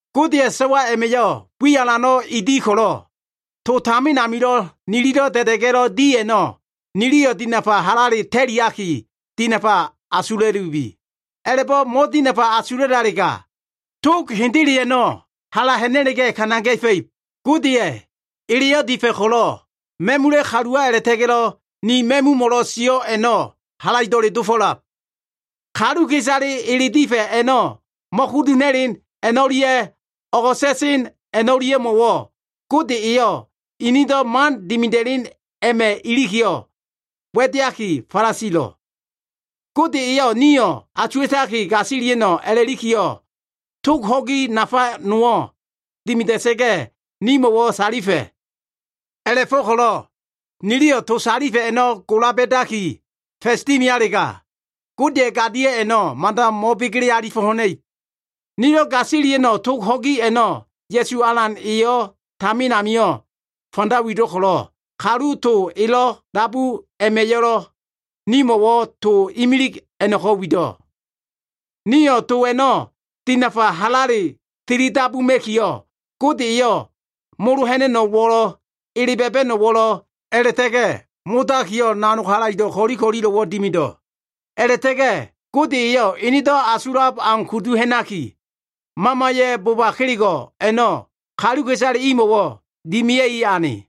Godeya꞉ so꞉wa a꞉ma꞉yo꞉ wi alano꞉ E di ko꞉lo꞉, to tamin amilo꞉ nililo꞉ da꞉da꞉ga꞉lo꞉ di a꞉no꞉ niliyo꞉ dinafa halale ta꞉liaki, dinafa asula꞉lubi. A꞉la꞉bo꞉ mo꞉dinafa asula꞉lalega, tog hendele a꞉no꞉ hala ha꞉na꞉la꞉ga꞉ kana ga꞉fa꞉ib. Godeya꞉ eleyo꞉ difa꞉ ko꞉lo꞉ ma꞉mula꞉ kaluwa a꞉la꞉ta꞉ga꞉lo꞉ ni ma꞉mumo꞉lo꞉ sio꞉ a꞉no꞉ halaido꞉le dofo꞉lab. Kaluka꞉isale ele difa꞉ a꞉no꞉ mo꞉kudu ha꞉na꞉len a꞉no꞉lia꞉ o꞉go꞉sa꞉len a꞉no꞉lia꞉mo꞉wo꞉, Gode eyo꞉ inido꞉ man dimida꞉len a꞉ma꞉ ilikiyo꞉, wa꞉deaki falasilo꞉. Gode eyo꞉ nio꞉ asuwa꞉taki gasilia꞉no꞉ a꞉la꞉likiyo꞉, tog ho꞉gi nafa nowo꞉ dimida꞉sa꞉ga꞉, nimo꞉wo꞉ salifa꞉. A꞉la꞉fo꞉ko꞉lo꞉ niliyo꞉ to salifa꞉ a꞉no꞉ gola ba꞉daki fa꞉s dimialega, Godeya꞉ gadio꞉ a꞉no꞉ mada mo꞉begele alifo꞉ ha꞉na꞉ib. Nilo꞉ gasilia꞉no꞉ tog ho꞉gi a꞉no꞉, Ya꞉su Alan eyo꞉ tamin amio꞉ fanda wido꞉ ko꞉lo꞉, kalu to elo꞉lo꞉ dabu a꞉ma꞉yo꞉lo꞉ nimo꞉wo꞉ to imilig a꞉no꞉ko꞉ wido꞉. Nio꞉ to a꞉no꞉ dinafa halale tilidabuma꞉kiyo꞉, Gode eyo꞉ molo ha꞉na꞉no꞉wo꞉lo꞉, ele ba꞉ba꞉no꞉wo꞉lo꞉, a꞉la꞉ta꞉ga꞉ modakiyo꞉ nanog halaido꞉ ko꞉li ko꞉lilo꞉wo꞉ dimido꞉. A꞉la꞉ta꞉ga꞉ Gode eyo꞉ enedo꞉ asulab au kudu ha꞉naki, Mamaya꞉ boba kelego꞉ a꞉no꞉ kaluka꞉isale imo꞉wo꞉ dimea꞉i ane.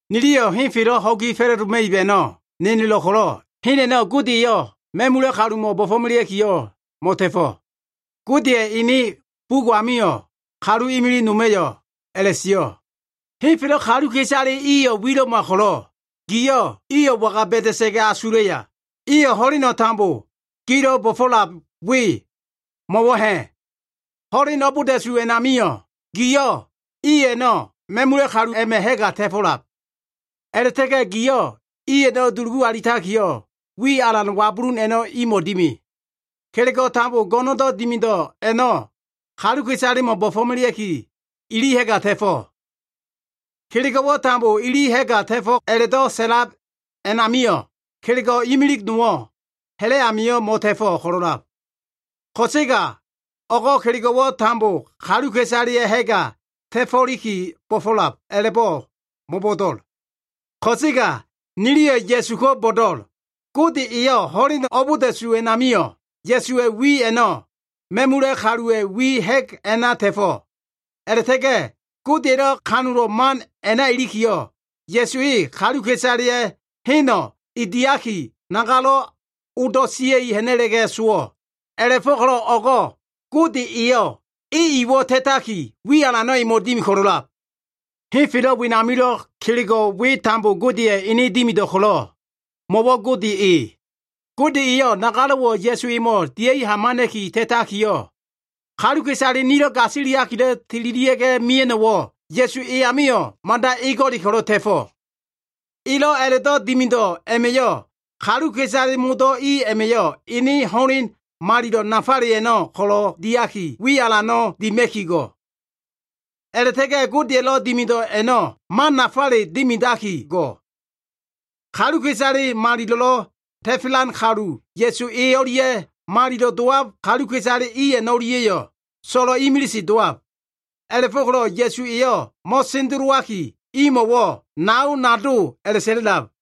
Niliyo꞉ henfelo꞉ ho꞉gi fa꞉la꞉doma꞉ib a꞉no꞉ nenelo꞉l ko꞉lo꞉, hen a꞉no꞉ Gode eyo꞉ ma꞉mula꞉ kalumo꞉ bo꞉fo꞉melea꞉kiyo꞉ mo꞉ta꞉fo꞉. Godeya꞉ ene bugo꞉ amio꞉ kalu imilig noma꞉yo꞉ a꞉la꞉sio꞉, “Henfelo꞉ kaluka꞉isale iyo꞉ wilo꞉ma ko꞉lo꞉, giyo꞉ iyo꞉ waga ba꞉da꞉sa꞉ga꞉ asulaya? Iyo꞉ ho꞉leno꞉ tambo gilo꞉ bo꞉fo꞉lab we mo꞉wo꞉ ha꞉? Ho꞉leno꞉ abolda꞉su a꞉namio꞉, giyo꞉ i a꞉no꞉ ma꞉mula꞉ kalu a꞉ma꞉ ha꞉ga ta꞉fo꞉lab. A꞉la꞉ta꞉ga꞉ giyo꞉ iyo꞉ dulugu alitakiyo꞉, wi alan wabulun a꞉no꞉ imo꞉ dimi. Kelego꞉ tambo go꞉no꞉ndo꞉ dimido꞉ a꞉no꞉ kaluka꞉isalemo꞉ bo꞉fo꞉melea꞉ki, ili ha꞉ga ta꞉fo꞉.” Kelego꞉wo꞉ tambo ili ha꞉ga ta꞉fo꞉ a꞉la꞉do꞉ sa꞉lab a꞉namio꞉, kelego꞉ imili nowo꞉ ha꞉la꞉ amio꞉ mo꞉ta꞉fo꞉ ko꞉lo꞉lab. Ko꞉sega o꞉go꞉ kelego꞉wo꞉ tambo kaluka꞉isaleya꞉ ha꞉ga ta꞉fo꞉liki bo꞉fo꞉lab a꞉la꞉bo꞉ mo꞉bo꞉do꞉l. Ko꞉sega niliyo꞉ Ya꞉su ko꞉ bo꞉do꞉l. Gode eyo꞉ ho꞉len abolda꞉su a꞉namio꞉, Ya꞉suwa꞉ wi a꞉no꞉ ma꞉mula꞉ kaluwa꞉ wi ha꞉g a꞉na ta꞉fo꞉. A꞉la꞉ta꞉ga꞉ Godeya꞉lo꞉ kanulo꞉ man a꞉na ilikiyo꞉, Ya꞉su e kaluka꞉isaleya꞉ heno꞉ e diaki, nagalo꞉wo꞉ odo꞉ sia꞉i ha꞉na꞉la꞉ga꞉ sowo꞉. A꞉la꞉fo꞉ko꞉lo꞉ o꞉go꞉ Gode eyo꞉ e iwo꞉ ta꞉taki, wi alano꞉ emo꞉ dimi ko꞉lo꞉lab. Henfelo꞉ wenamilo꞉ kelego꞉ we tambo Godeya꞉ ene dimido꞉ ko꞉lo꞉, mo꞉wo꞉ Gode e. Gode eyo꞉ nagalo꞉wo꞉ Ya꞉su emo꞉ dia꞉i hamana꞉ki ta꞉takiyo꞉, kaluka꞉isale nilo꞉ gasiliakilo꞉ tililia꞉ga꞉ mia꞉no꞉wo꞉, Ya꞉su e amio꞉ mada ego꞉le ko꞉lo꞉ ta꞉fo꞉. Elo꞉ a꞉la꞉do꞉ dimido꞉ a꞉ma꞉yo꞉, kaluka꞉isale modo꞉ i a꞉ma꞉yo꞉ ene ho꞉len malilo꞉ nafale a꞉no꞉ ko꞉lo꞉ diaki, wi alan dima꞉ki go꞉. A꞉la꞉ta꞉ga꞉ Godeya꞉lo꞉ dimido꞉ a꞉no꞉ mano꞉ nafale dimidaki go꞉. Kaluka꞉isale malilo꞉lo꞉ ta꞉felan kalu Ya꞉su e o꞉lia꞉, malilo꞉lo꞉ dowab kaluka꞉isale i a꞉no꞉lia꞉yo꞉, so꞉lo꞉ imilise dowab. A꞉la꞉fo꞉ko꞉lo꞉ Ya꞉su eyo꞉ mo꞉sendelowaki, imo꞉wo꞉ “nao, nado” a꞉la꞉sa꞉la꞉lab.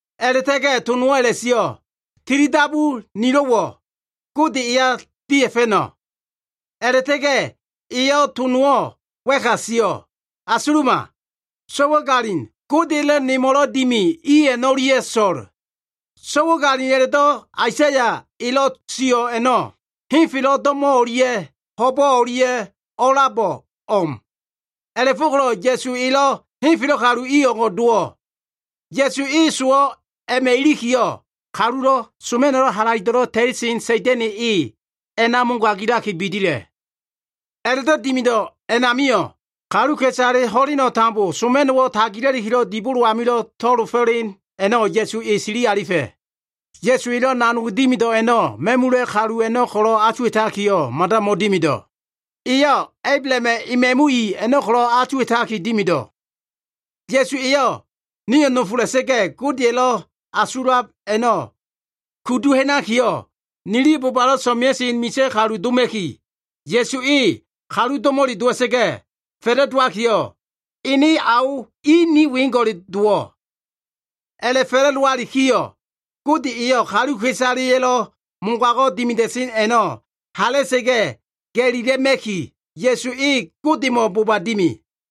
A꞉la꞉ta꞉ga꞉ to nowo꞉ a꞉la꞉sio꞉, “Tilidabu nilo꞉wo꞉ Gode eya dia꞉fa꞉no꞉.” A꞉la꞉ta꞉ga꞉ eyo꞉ to nowo꞉ wa꞉ka a꞉sio꞉, “Asuluma. So꞉wagalin Godeya꞉lo꞉ nemo꞉lo꞉ dimi i a꞉no꞉lia꞉ so꞉l.” So꞉wagalin a꞉la꞉do꞉ Aisaya elo꞉ sio꞉ a꞉no꞉ henfelo꞉ do꞉mo꞉ o꞉lia꞉ ho꞉bo꞉ o꞉lia꞉lo꞉ a꞉labo꞉ o꞉m. A꞉la꞉fo꞉ko꞉lo꞉ Ya꞉su elo꞉ henfelo꞉ kalu i o꞉ngo꞉ dowo꞉. Ya꞉su e sowo꞉ a꞉ma꞉ ilikiyo꞉, kalulo꞉ soma꞉no꞉ halaido꞉lo꞉ ta꞉lisen Sa꞉da꞉na꞉ e a꞉na mogagilaki bidila꞉. A꞉la꞉do꞉ dimido꞉ a꞉namio꞉, kaluka꞉isale ho꞉leno꞉ tambo soma꞉no꞉wo꞉ tagila꞉likilo꞉ dibolo amio꞉lo꞉ to꞉lo alifo꞉len a꞉no꞉ Ya꞉su e sili alifa꞉. Ya꞉su elo꞉ nanog dimido꞉ a꞉no꞉ ma꞉mula꞉ kalu a꞉no꞉ ko꞉lo꞉ asuwa꞉takiyo꞉ mada mo꞉dimido꞉. Eyo꞉ Ablahama꞉ ema꞉mu i a꞉no꞉ ko꞉lo꞉ asuwa꞉taki dimido꞉. Ya꞉su eyo꞉ nio꞉ nofola꞉sa꞉ga꞉, Godeya꞉lo꞉ asulab a꞉no꞉ kudu ha꞉nakiyo꞉, nili bobalo꞉ so꞉mea꞉sen misa꞉ kalu doma꞉ki, Ya꞉su e kalu do꞉mo꞉le dowa꞉sa꞉ga꞉ fa꞉la꞉dowaki, ene ao i ni weo꞉ngo꞉le dowo꞉. A꞉la꞉ fa꞉la꞉dowalikiyo꞉, Gode eyo꞉ kaluka꞉isaleya꞉lo꞉ mogago꞉ dimida꞉sen a꞉no꞉ hala꞉sa꞉ga꞉ ga꞉lila꞉ma꞉ki, Ya꞉su e Godemo꞉ boba dimi.